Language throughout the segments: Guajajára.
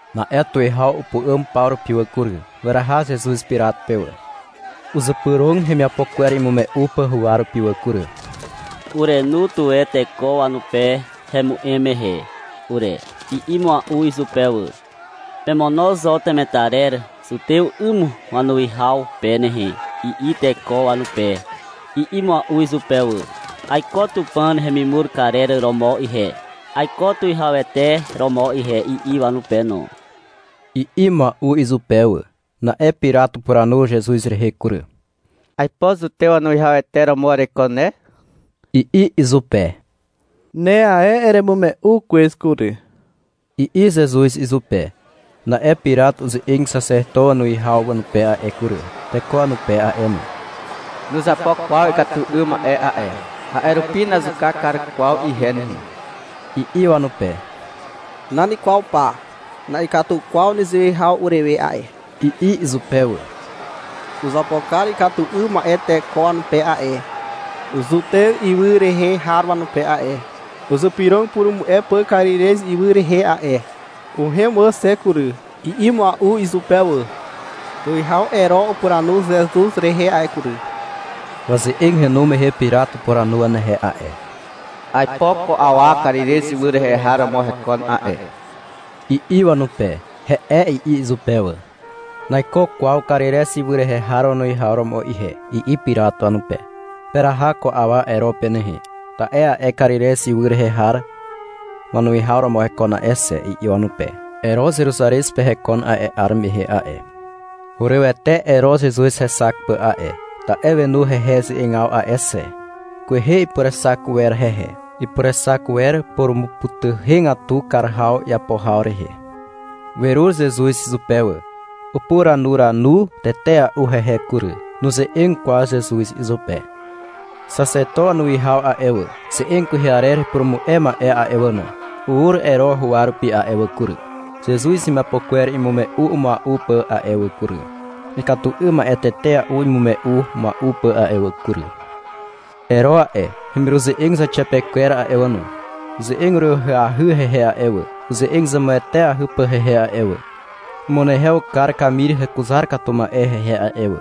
Na'e tuwihaw upu'àm paw rupi wà kury. Weraha Zezuz Pirat pe wà. Uzypyrog hemiapo kwer imume'u pà huwa rupi wà kury. — Urenu tuwe teko wanupe hemu'em mehe ure, i'i mua'u izupe wà. — Pemono zo temetarer zutew 'ym wanuwihaw pe nehe, i'i teko wanupe, i'i mua'u izupe wà. — Aiko Tupàn hemimur karer romo ihe, aiko Tuwihawete romo ihe, i'i wanupe no, i'i mua'u izupe wà. Na'e Pirat upuranu Zezuz rehe kury. — Aipo Zutew wanuwihawete romo ereiko ne, i'i izupe. — Ne ae eremume'u kwez kury, i'i Zezuz izupe. Na'e Pirat uze'eg xaxeto wanuwihaw wanupe a'e kury, teko wanupe a'e no. — Nuzapo kwaw ikatu 'ym ma'e a'e. A'e rupi nazuka kar kwaw ihe nehe, i'i wanupe. — Nan kwaw pa, na'ikatu kwaw nezewe haw urewe a'e, i'i izupe wà. — Uzapo kar ikatu 'ym ma'e teko wanupe a'e, Zutez ywy rehe har wanupe a'e. Uzypyrog upurumu'e pà Karirez ywy rehe a'e. Uhem wà xe kury, i'i mua'u izupe wà. Tuwihaw Ero upuranu Zezuz rehe a'e kury. Waze'eg henu mehe Pirat upuranu wanehe a'e. Aipo ko awa Karirez ywy rehe har romo hekon a'e, i'i wanupe. (— He'e, i'i izupe wà.) — Naiko kwaw Karirez ywy rehe har wanuwihaw romo ihe, i'i Pirat wanupe. — Peraha ko awa Ero pe nehe, ta'e a'e ae Karirez ywy rehe har wanuwihaw romo hekon a'e xe, i'i wanupe. Ero Zeruzarez pe hekon a'e 'ar mehe a'e. Hurywete Ero Zezuz hexak pà a'e. Ta'e wenu hehe ze'egaw a'e xe. Kwehe ipurexak wer hehe. Ipurexak wer purumupytuhegatu kar haw iapo haw rehe. Werur Zezuz izupe wà. Upuranuranu tetea'u hehe kury. Nuze'eg kwaw Zezuz izupe. Xaxeto wanuwihaw a'e wà, ze'eg kwehe arer rehe upurumu'e ma'e a'e wà no, ur Ero huwa rupi a'e wà kury, Zezuz hemiapo kwer imume'u mua'u pà a'e wà kury, ikatu 'ym ma'e tetea'u imume'u mua'u pà a'e wà kury. Ero a'e, hemiruze'eg zauxiapekwer a'e wà no, uze'eg uryw ahyahy hehe a'e wà, uze'eg zemueteahy pà hehe a'e wà. Umunehew kar kamir hekuzar katu ma'e hehe a'e wà.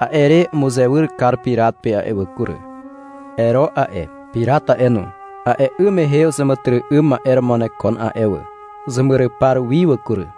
A'e re umuzewyr kar Pirat pe a'e wà kury. Ero a'e, Pirat a'e no, a'e 'ym mehe uzeàmàtyry'ym ma'e romo wanekon a'e wà. Uzemyrypar wi wà kury.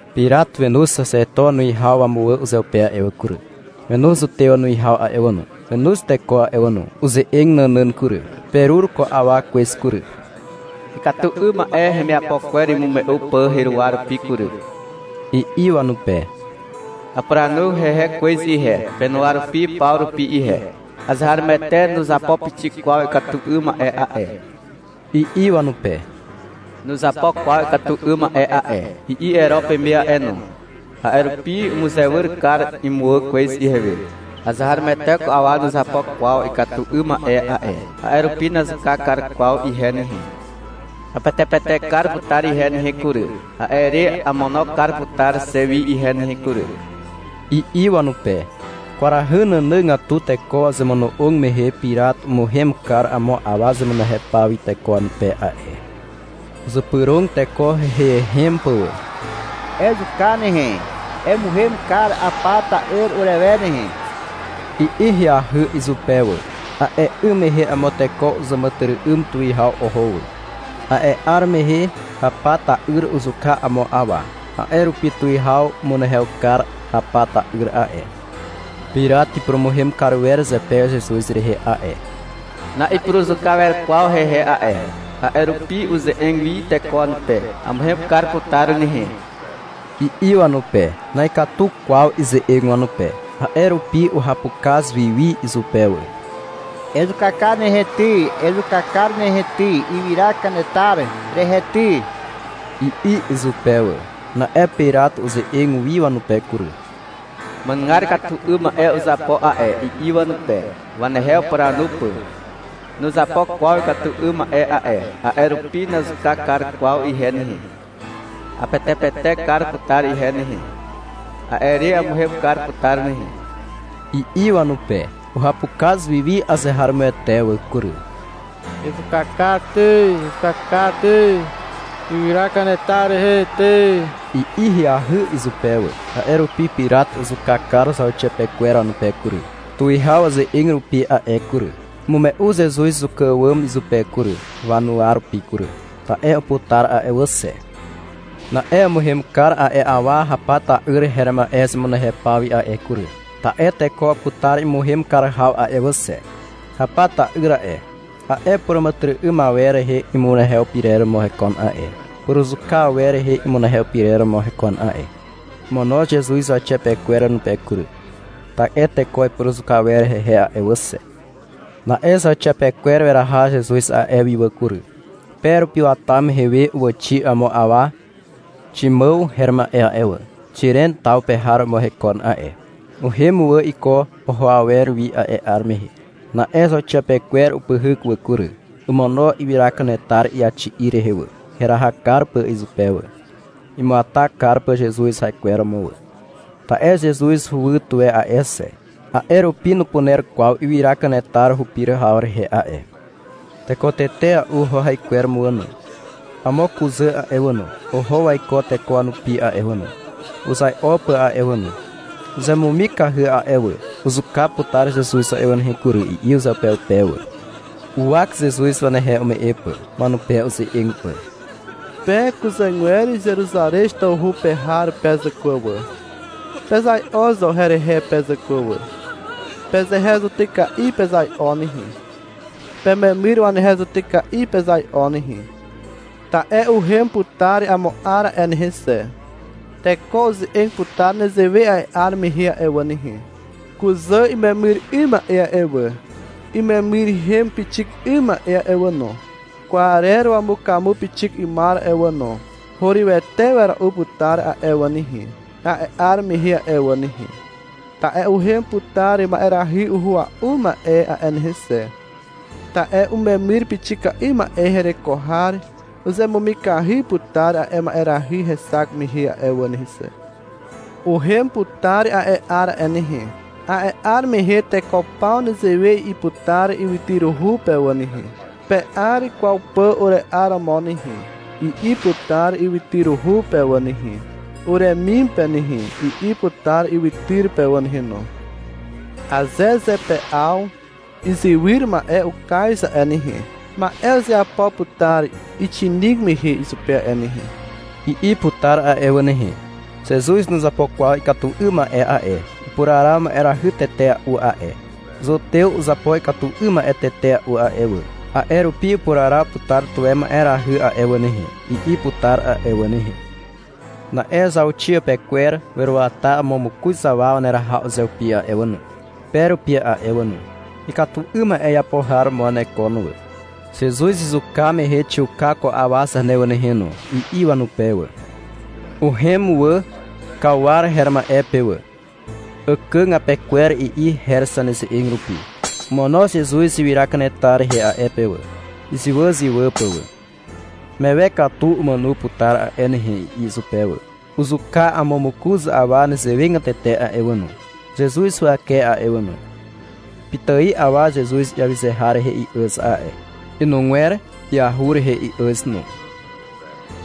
Pirat wenoz xaxeto wanuwihaw wamuwà uzeupe a'e wà kury, wenoz Zutew wanuwihaw a'e wà no, wenoz teko a'e wà no. Uze'eg nànàn kury. — Perur ko awa kwez kury, ikatu 'ym ma'e hemiapo kwer imume'u pà heruwa rupi kury, i'i wanupe. — Apuranu hehe kwez ihe, penuwa rupi paw rupi ihe. Azeharomoete nuzapo pixik kwaw ikatu 'ym ma'e a'e, i'i wanupe. — Nuzapo kwaw ikatu 'ym ma'e a'e, i'i Ero peme a'e no. A'e rupi umuzewyr kar imuwà kwez ihewe. Azeharomoete ko awa nuzapo kwaw ikatu 'ym ma'e a'e, a'e rupi nazuka kar kwaw ihe nehe. Apetepetek kar putar ihe nehe kury, a'e re amono kar putar xe wi ihe nehe kury, i'i wanupe. (Kwarahy nànàgatu teko wazemono'og mehe Pirat umuhem kar amo awa zemunehew paw wi teko wanupe a'e.) Uzypyrog teko heiheihem pà wà. — Ezuka nehe, emuhem kar Hapa ta'yr urewe nehe, i'i ahyahy izupe wà. A'e 'ym mehe amo teko uzàmàtyry'ym tuwihaw oho wà. A'e 'ar mehe Hapa ta'yr uzuka amo awa. A'e rupi tuwihaw umunehew kar Hapa ta'yr a'e. Pirat ipurumuhem kar wer zepe Zezuz rehe a'e. Na'ipuruzuka wer kwaw hehe a'e. A'e rupi uze'eg wi teko wanupe. — Amuhem kar putar nehe, i'i wanupe. Na'ikatu kwaw ize'eg wanupe. A'e rupi uhapukaz wiwi izupe wà. — Ezuka kar nehe ty, ezuka kar nehe ty, ywyra kanetar rehe ty, i'i izupe wà. Na'e Pirat uze'eg wi wanupe kury. — Ma'enugar ikatu 'ym ma'e uzapo a'e, i'i wanupe, wanehe upuranu pà. — Nuzapo kwaw ikatu 'ym ma'e a'e, a'e rupi nazuka kar kwaw ihe nehe. Apetepetek kar putar ihe nehe. A'e re amuhem kar putar nehe, i'i wanupe. Uhapukaz wiwi azeharomoete wà kury. — Ezuka kar ty, ezuka kar ty, ywyra kanetar rehe ty, i'i ahyahy izupe wà. A'e rupi Pirat uzuka kar zauxiapekwer wanupe kury, tuwihaw waze'eg rupi a'e kury. Umume'u Zezuz zuka àwàm izupe kury, wanuwa rupi kury, ta'e uputar a'e wà xe. Na'e umuhem kar a'e awa Hapa ta'yr her ma'e zemunehew paw wi a'e kury, ta'e teko uputar imuhem kar haw a'e wà xe. (Hapa ta'yr a'e, a'e puràmàtyry'ym awer rehe imunehew pyrer romo hekon a'e, puruzuka awer rehe imunehew pyrer romo hekon a'e.) Omono Zezuz zauxiapekwer wanupe kury, ta'e teko ipuruzuka wer hehe a'e wà xe. Na'e zauxiapekwer weraha Zezuz a'e wi a'e wà kury. Pe rupi wata mehe we uwàxi amo awa Ximàw her ma'e a'e wà. Xiren taw pe har romo hekon a'e. Uhem wà iko oho awer wi a'e 'ar mehe. Na'e zauxiapekwer upyhyk wà kury. Omono ywyra kanetar iaxi'i rehe wà, heraha kar pà izupe wà, imuata kar pà Zezuz haikwer romo wà. (Ta'e Zezuz huwy tuwe a'e xe, a'e rupi nupuner kwaw ywyra kanetar hupir haw rehe a'e.) Teko tetea'u oho haikwer romo wà no. Amo kuzà a'e wà no, oho waiko teko wanupi a'e wà no, uzai'o pà a'e wà no. Uzemumikahy a'e wà. — Uzuka putar Zezuz a'e wà nehe kury, i'i uzeupeupe wà. Uwak Zezuz wanehe ume'e pà, wanupe uze'eg pà. — Pe kuzàgwer Zeruzarez tawhu pe har pe zàkwà wà, pezai'o zo herehe pe zàkwà wà. Pezehe zutyka'i pezai'o nehe, pememyr wanehe zutyka'i pezai'o nehe. Ta'e uhem putar amo 'ar a'e nehe xe. Teko uze'eg putar nezewe a'e 'ar mehe a'e wà nehe. — Kuzà imemyr 'ym ma'e a'e wà, imemyrhem pixik 'ym ma'e a'e wà no, kwarer wamukamu pixik 'ymar a'e wà no, hurywete wera'u putar a'e wà nehe, a'e 'ar mehe a'e wà nehe. (Ta'e uhem putar ma'erahy uhua'u ma'e a'e nehe xe. Ta'e umemyr pixika'i ma'e hereko har uzemumikahy putar a'e ma'erahy hexak mehe wà nehe xe.) Uhem putar a'e 'ar a'e nehe. A'e 'ar mehe teko paw nezewe i'i putar ywytyruhu pe wà nehe, — Pe'ar kwaw pà ure'aromo nehe, i'i putar ywytyruhu pe wà nehe. — Uremim pe nehe, i'i putar ywytyr pe wà nehe no. — Aze zepe'aw izywyr ma'e ukaz a'e nehe, ma'e uzeapo putar ixinig mehe izupe a'e nehe, i'i putar a'e wà nehe. (— Zezuz nuzapo kwaw ikatu 'ym ma'e a'e. Upuraraw ma'erahy tetea'u a'e. Zutew uzapo ikatu 'ym ma'e tetea'u a'e wà. A'e rupi upuraraw putar tuwe ma'erahy a'e wà nehe, i'i putar a'e wà nehe.) Na'e zauxiapekwer weruata amo mokoz awa waneraha uzeupi a'e wà no, pe rupi a'e wà no. Ikatu 'ym ma'e iapo har romo wanekon wà. — Zezuz izuka mehe xiuka ko awa zane wà nehe no, i'i wanupe wà. Uhem wà Kauar her ma'e pe wà. — Àkàg apekwer, i'i her zaneze'eg rupi. Omono Zezuz ywyra kanetar rehe a'e pe wà, izywàzywà pà wà. (Mewe katu umàno putar a'e nehe, i'i izupe wà.) Uzuka amo mokoz awa nezewegatete a'e wà no, Zezuz huwake a'e wà no. Pitài awa Zezuz iawyze har rehe i'àz a'e. Inugwer iahur rehe i'àz no.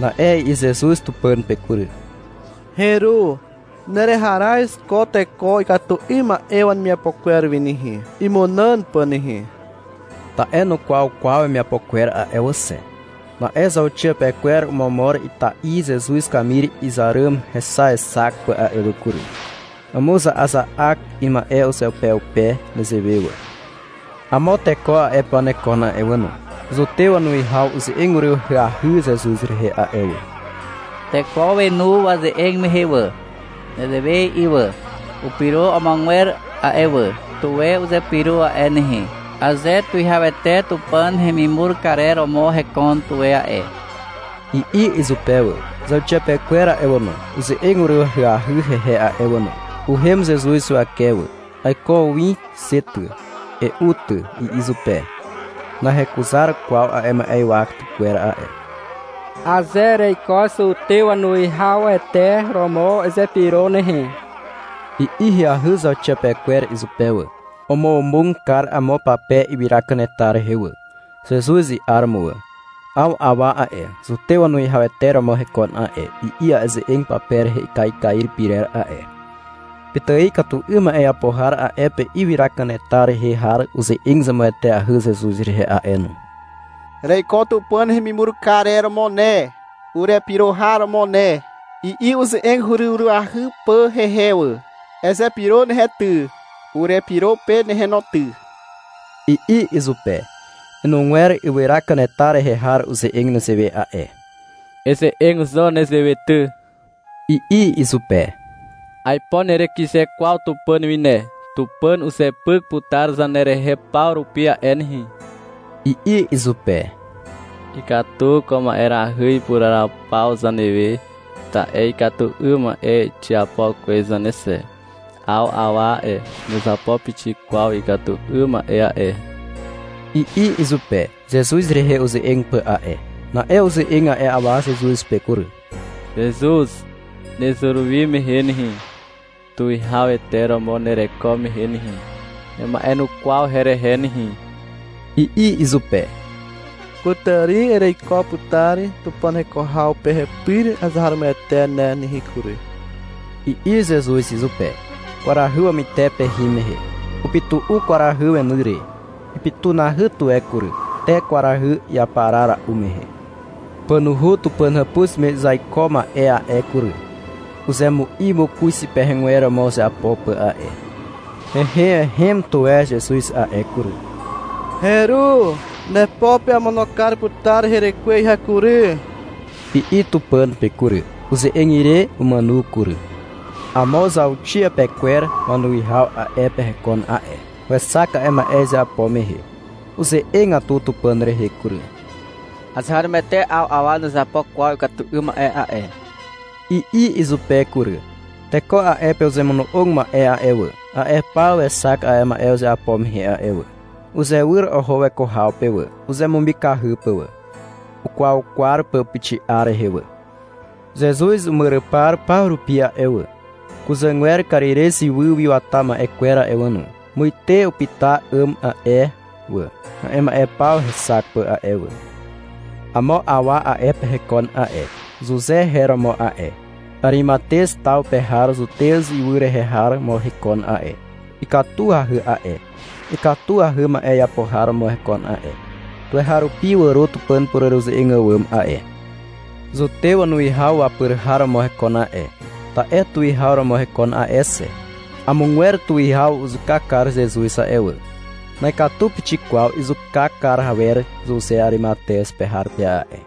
Na'e i'i Zezuz Tupàn pe kury. — Heru, nereharaz ko teko ikatu 'ym ma'e wanemiapo kwer wi nehe, imunàn pà nehe. Ta'e nukwaw kwaw wemiapo kwer a'e wà xe. Na'e zauxiapekwer omomor ita'i Zezuz kamir izar ràm hexaexak pà a'e wà kury. Umuza'aza'ak ima'e uzeupeupe nezewe wà. Amo teko a'e pe wanekon a'e wà no. Zutew wanuwihaw uze'eg uryw ahyahy Zezuz rehe a'e wà. Teko wenu waze'eg mehe wà. Nezewe i'i wà. — Upyro amogwer a'e wà. Tuwe uzepyro a'e nehe, aze Tuwihawete Tupàn hemimur karer romo hekon tuwe a'e, i'i izupe wà. Zauxiapekwer a'e wà no, uze'eg uryw ahyahy hehe a'e wà no. Uhem Zezuz huwake wà. — Aiko win xe ty, e'u ty, i'i izupe. (Nahekuzar kwaw a'e ma'ywa tykwer a'e.) — Aze ereiko Zutew wanuwihawete romo, ezepyro nehe, i'i ahyahy zauxiapekwer izupe wà. Omomog kar amo pape ywyra kanetar rehe wà, Zezuz i'aromo wà. 'Aw awa a'e, Zutew wanuwihawete romo hekon a'e, i'i a'e ze'eg pape rehe ikaikair pyrer a'e. Pitài ikatu 'ym ma'e iapo har a'e pe ywyra kanetar rehe har uze'eg zemueteahy Zezuz rehe a'e no. — Ereiko Tupàn hemimur karer romo ne, urepyro har romo ne, i'i uze'eg uryw ahyahy pà hehe wà. — Ezepyro nehe ty, urepyro pe nehe no ty, i'i izupe. Inugwer ywyra kanetar rehe har uze'eg nezewe a'e. — Eze'eg zo nezewe ty, i'i izupe. — Aipo nerekyze kwaw Tupàn wi ne, Tupàn uzepyk putar zanerehe paw rupi a'e nehe, i'i izupe. — Ikatu ko ma'erahy ipuraraw paw zanewe, ta'e ikatu 'ym ma'e xiapo kwez zane xe. 'Aw awa a'e, nuzapo pixik kwaw ikatu 'ym ma'e a'e, i'i izupe, Zezuz rehe uze'eg pà a'e. Na'e uze'eg a'e awa Zezuz pe kury. — Zezuz, nezur wi mehe nehe, Tuwihawete romo nereko mehe nehe, nema'enukwaw herehe nehe, i'i izupe. — Kutàri ereiko putar Tupàn heko haw pe hepyr azeharomoete ne nehe kury, i'i Zezuz izupe. Kwarahy wapytepe hin mehe. Upytu'u kwarahy weny re. Ipytunahy tuwe kury, te kwarahy iaparara'u mehe. Pànuhu Tupàn hàpuz me izaiko ma'e a'e kury, uzemu'i mokoz ipehegwer romo uzeapo pà a'e. Heiheihem tuwe Zezuz a'e kury. — Heru, nepo pe amono kar putar herekwe ihe kury, i'i Tupàn pe kury. Uze'eg ire, umàno kury. Amo zauxiapekwer wanuwihaw a'e pe hekon a'e. Wexak a'e ma'e izeapo mehe. Uze'egatu Tupàn rehe kury. — Azeharomoete 'aw awa nuzapo kwaw ikatu 'ym ma'e a'e, i'i izupe kury. Teko a'e pe uzemono'og ma'e a'e wà, a'e paw wexak a'e ma'e uzeapo mehe a'e wà. Uzewyr oho weko haw pe wà, uzemumikahy pà wà, ukwaukwar pà upuxi'a rehe wà. Zezuz imyrypar paw rupi a'e wà, kuzàgwer Karirez ywy wi wata ma'e kwer a'e wà no, muite upyta 'àm a'e wà, a'e ma'e paw hexak pà a'e wà. Amo awa a'e pe hekon a'e. Zuze her romo a'e. Arimatez taw pe har Zutez ywy rehe har romo hekon a'e. Ikatuahy a'e. Ikatuahy ma'e iapo har romo hekon a'e. Tuweharupi wàro Tupàn pureruze'eg àwàm a'e. Zutew wanuwihaw wapyr har romo hekon a'e, ta'e tuwihaw romo hekon a'e xe. Amogwer tuwihaw uzuka kar Zezuz a'e wà. Na'ikatu pixik kwaw izuka kar awer Zuze Arimatez pe har pe a'e.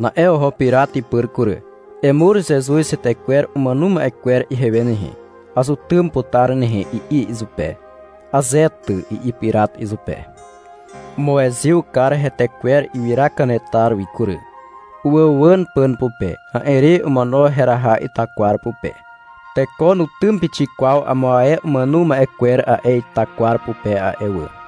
Na'e oho Pirat ipyr kury. — Emur Zezuz hetekwer umàno ma'e kwer ihewe nehe. Azutym putar nehe, i'i izupe. — Aze ty, i'i Pirat izupe. Umuezyw kar hetekwer ywyra kanetar wi kury. Uwàuwàn pàn pupe. A'e re omono heraha itakwar pupe. Teko nutym pixik kwaw amo ae umàno ma'e kwer a'e ita kwar pupe a'e wà.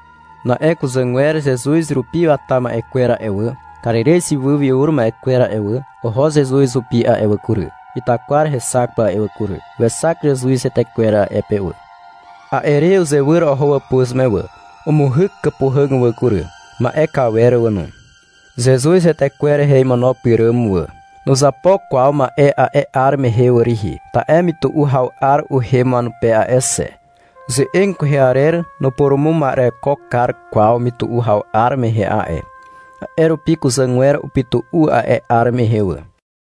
Na'e kuzàgwer Zezuz rupi wata ma'e kwer a'e wà, Karirez ywy wi ur ma'e kwer a'e wà, oho Zuze hupi a'e wà kury, itakwar hexak pà a'e wà kury. Wexak Zezuz hetekwer a'e pe wà. A'e re uzewyr oho wàpuz me wà. Umuhyk kàpuhàg wà kury, ma'e kawer wà no, Zezuz hetekwer rehe imono pyràm wà. Nuzapo kwaw ma'e a'e 'ar mehe wà rihi, ta'e mytu'u haw 'ar uhem wanupe a'e xe. Ze'eg kwehe arer nupurumuma'ereko kar kwaw mytu'u haw 'ar mehe a'e. A'e rupi kuzàgwer upytu'u a'e 'ar mehe wà.